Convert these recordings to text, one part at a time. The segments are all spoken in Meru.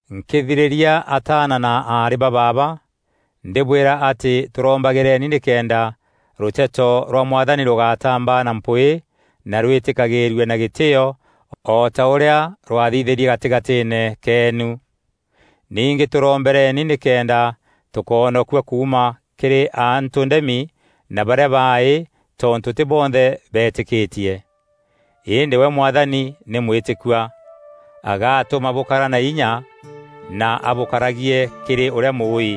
Nkîthirîria ataana na aarî ba baaba ndîbwîra atî tûrombagîreni nîkenda rûteto rwa Mwathani rûgatamba na mpwîî na rwîtîkagîîrue na gîtîîo o ta ûrîa rwathithîrie gatîgatîîne keenu. Ningî tûrombereni nîkenda tûkoonokua kuuma kîrî antû ndemi na barîa baaî, tontû tî bonthe betîkîtie. Îndî we Mwathani nî mwîtîkua. Agatûma bûkara na inya na abûkaragie kîrî ûrîa Mûûî.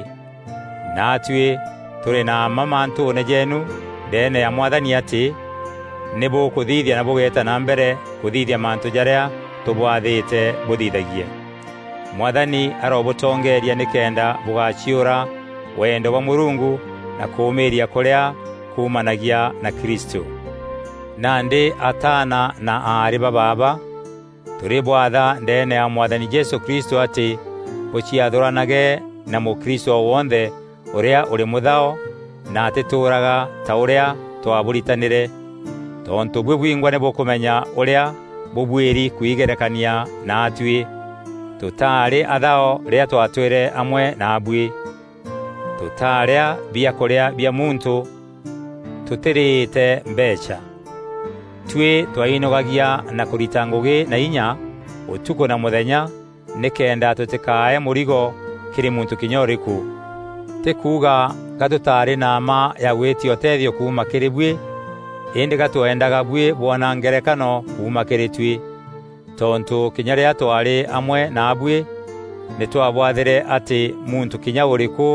Naatuî tûrî na mma mantûûne jeenu ndeene ya Mwathani, atî nî bûkûthithia na bûgeeta na mbere kûthithia mantû jarîa tûbwathîte bûthithagie. Mwathani arobûtongeeria nîkenda bûgaciûra wendo bwa Mûrungu na kûûmîîria kûrîa kumanagia na Kristû. Nandî ataana na aarî ba baaba, tûrîbwatha ndeene ya Mwathani Jesû Kristû, atî bûciathûranage na mûkristû o wonthe ûrîa ûrî mûthao na atîtûûraga ta ûrîa twaabûritanîre. Tontû buî bwingwa nî bûkûmenya ûrîa bûbuîri kwigerekania naatuî. Tûtaarî athao rîrîa twaatwîre amwe naabuî. Tûtaarîa biakûrîa bia muntû tûtîrîte mbeecha. Tuî twainogagia na kûrita ngûgî na inya ûtukû na mûthenya nîkenda tûtîkae mûrigo kîrî muntû kinya ûrîkû. Tî kuuga ga tûtaarî na mma ya gwîtia ûtethio kuuma kîrî buî, îndî ga twendaga buî bwona ngerekano kuuma kîrî tuî. Tontû kinya rîrîa twaarî amwe naabuî nî twaabwathîre atî muntû kinya ûrîkû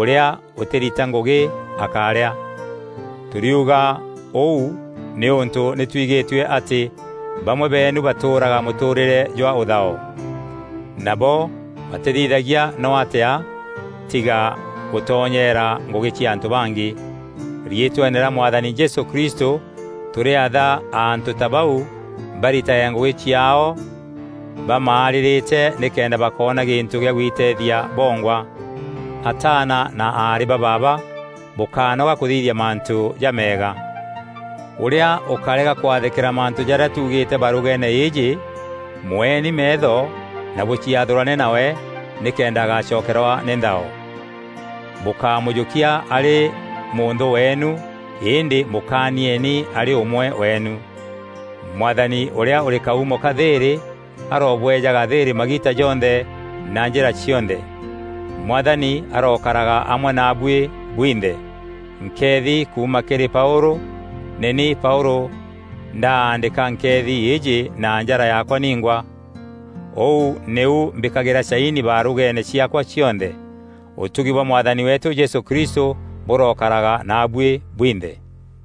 ûrîa ûtîrita ngûgî akárîa. Tûriuga ûu nîûntû nî twigîtue atî bamwe beenu batûûraga mûtûûrîre jwa ûthao. Nabo batîthithagia no atîa tiga gûtonyeera ngûgî cia antû bangî. Riîtweene rîa Mwathani Jesû Kristû tûrîatha antû ta bau baritage ngûgî ciaao bamaarîrîte nîkenda bakoona gîntû gîa gwiteethia bongwa. Ataana na aarî ba baaba bûkánoga kûthithia mantû jameega. Ûrîa ûkarega kwathîkîra mantû jarîa tuugîîte barûgeene îîjî, mweeni meetho na bûciathûrane nawe, nîkenda agacokerwa nî nthao. Bûkámûjûkia arî mûnthû weenu îndî mûkaanieni arî ûmwe weenu. Mwathani ûrîa ûrî kaumo ka thîîrî arobweejaga thîîrî magiita jonthe na njîra cionthe. Mwathani arokaraga amwe naabuî bwinthe. Nkeethi kuuma kîrî Paûlû: nî ni Paûlû ndaandîka nkeethi îîjî na njara yaakwa ningwa. Ûu nîu mbîkagîra caini barûgeene ciaakwa cionthe. Ûtugi bwa Mwathani weetû Jesû Kristû bûrokaraga naabuî bwinthe.